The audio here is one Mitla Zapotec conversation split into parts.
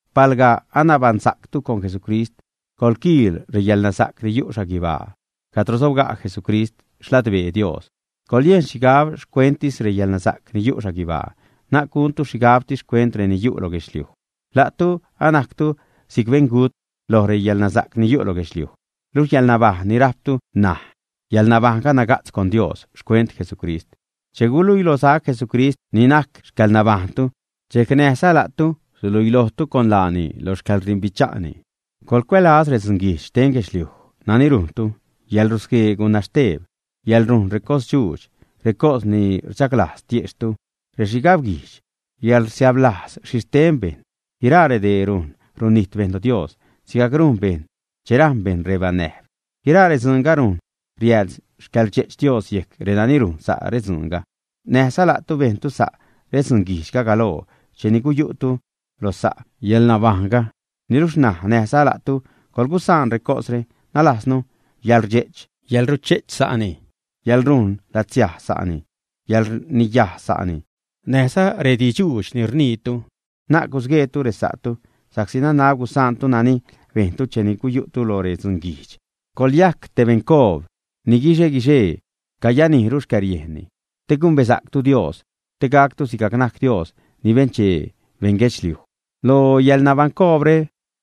Palga anabaṉsactu con Jesucrist, coḻquiil reyäḻnasa'c ni yu' xhaguibaa cadro sobga' Jesucrist xladbee Dios. Coḻyejn xhigab xcuenttis reyäḻnasa'c ni yu' xhaguibaa, na'c guntu xhigabtis xcuent reni yu' lo guedxliuj. La'tu anajctu si'c beṉgut loj reyäḻnasa'c ni yu' lo guedxliuj, luxh yäḻnabajṉ ni rajptu ṉaj, yäḻnabajṉga naga'tz con Dios xcuent Jesucrist. Che guluiilosac Jesucrist ni najc xcäḻnabajṉtu, dxejc näjza la'tu suluiilojtu con laani lo xcäḻrdimbicha'ni. Coḻcuälaz redzunguijdx xten guedxliuj nani rujntu, yäḻrusguee gunaxteb, yäḻrujn recosdxuudx, recos ni rdxaglajz tiejxhtu, rexhigab-guijdx, yäḻrsiäb-lajz xhi xten bejṉ, guiraa redee rujn runijt bejṉ lo Dios sigajc rujn bejṉ che rajṉ bejṉ rebanäjb. Guiraa redzuunga rujn riääd xcäḻrdxe'ch Dios yejc renani rujn sa' redzuunga. Näjza la'tu bejntu sa' redzunguijdxga galoo cheni guyu'tu lo sa' yäḻnabajṉga. Niluxh ṉaj näjza la'tu coḻgusaan recosre; nalajznu yäḻrdxe'ch, yäḻruche'ch sa'ni, yäḻrujn latzsiaj sa'ni, yäḻrniyaj sa'ni, näjza rediidx-dxuudx ni rniitu. Na'c gusgueetu resa'tu, sa'csi nanab gusaantu nani bejntu cheni guyu'tu loj redzunguijdx. Coḻyajc te beṉcoob, ni guixe-guixee cayanijru xcäriejnni, te gumbesa'ctu Dios, te gactu sigajc najc Dios ni benchee beṉguedxliuj. Lo yäḻnabaṉcoobre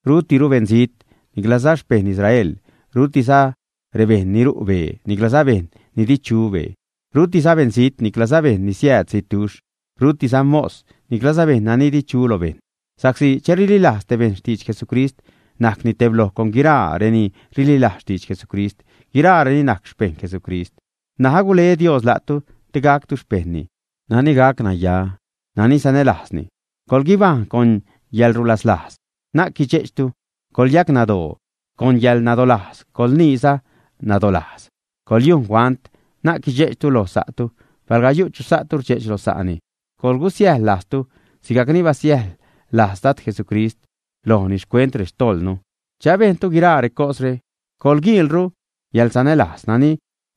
rutiru beṉzijt, niclaza xpeṉ Israel, rutiza rebejṉ ni ru' bee, niclaza bejṉ ni di chu bee; rutiza beṉzijt, niclaza bejṉ ni siääd zitduxh; rutiza mos, niclaza bejṉ nani di chu lo bejṉ, sa'csi che rililajz te bejṉ xtidx Jesucrist najcni tebloj con guiraa reni rililajz xtidx Jesucrist; guiraareni najc xpejṉ Jesucrist. N̲aj agule Dios la'tu te gactu xpejṉni nani gac naya, nani sanälajzni, coḻguibajṉ con yäḻrulaslajz, na'c guidxe'chtu, coḻyacnadoo con yäḻnadolajz, coḻniiza nadolajz. Coḻyujn huant, na'c guidxe'chtu loj sa'tu, palga yu' chu sa'tu rdxe'ch loj sa'ni, coḻgusiäjḻ-lajztu sigajcni basiäjḻ-lajz Dad Jesucrist lojnu xcuent rextojḻnu. Che abejntu guiraa recosre, coḻguiilru yäḻsanälajz nani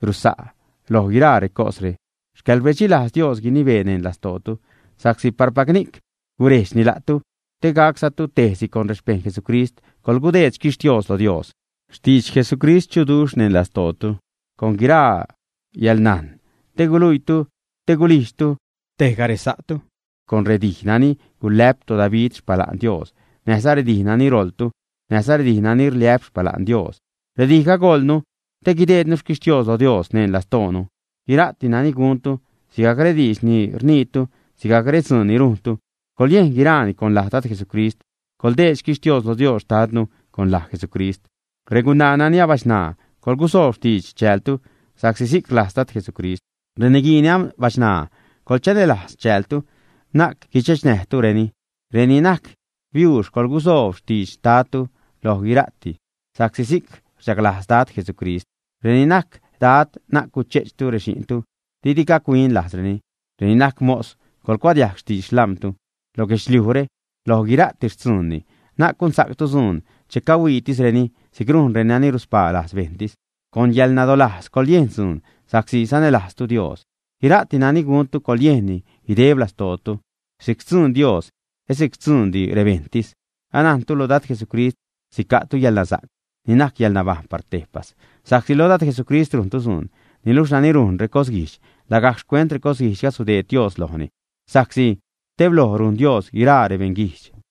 rusa' loj guiraa recosre. Xcäḻrbedxilajz Dios guinibee neṉ lastootu, sa'csi parpac ni'c gurejdxni la'tu, te gaczatu tejsi con rexpejṉ Jesucrist. Coḻgudeed xquixtios loj Dios. Xtidx Jesucrist chuduxh neṉ lastootu con guiraa yäḻnajn, te guluiitu, te gulijdxtu tejga resa'tu con redij nani gulä'p toDavid xpala'n Dios, näjza redij nani roḻtu, näjza redij nani rliä'p xpala'n Dios. Redijga goḻnu te guideednu xquixtios lo Dios neṉ lastoonu. Guira'ti nani guntu, sigajc rediidx ni rniitu, sigajcza redzuun ni rujntu, coḻyejn guiraani con laj Dad Jesucrist, coḻdeed xquixtios lo Dios xtadnu con laj Jesucrist. Regunaa nani abachṉaa, coḻgusoob xtidx chäältu sa'csi si'c rlajz Dad Jesucrist. Reniguii nani abachṉaa, coḻchanälajz chäältu, na'c guidxechnäjtureni. Reni najc biuux, coḻgusoob xtidx xtadtu loj guira'ti, sa'csi si'c rchaglajz Dad Jesucrist. Reni najc Dad, na'c guche'chtu rexi'ntu, didi gac-huin lajzreni. Reni najc mos, coḻgucuadiajg xtidx xlam̲tu lo guedxliujre loj guira'ti xtzuunni. Na'c gunsa'ctu dzuun che cahuiitisreni si'c rujn renani ruspaa lajz bejṉtis. Con yäḻnadolajz coḻyejn dzuun sa'csi sanälajztu Dios. Guira'ti nani guntu, coḻyejnni guideb lastootu si'c xtzuun Dios, et si'c xtzuundi rebejṉtis. Anajntu lo Dad Jesucrist sica'tu yäḻnasa'c ni najc yäḻnabajṉ par tejpas, sa'csi loj Dad Jesucrist rujntu dzuun. Niluxh nani rujn recosguijdx, lagajc xcuent recosguijdxga gudeed Dios lojni, sa'csi tebloj rujn Dios guiraa rebeṉguijdx.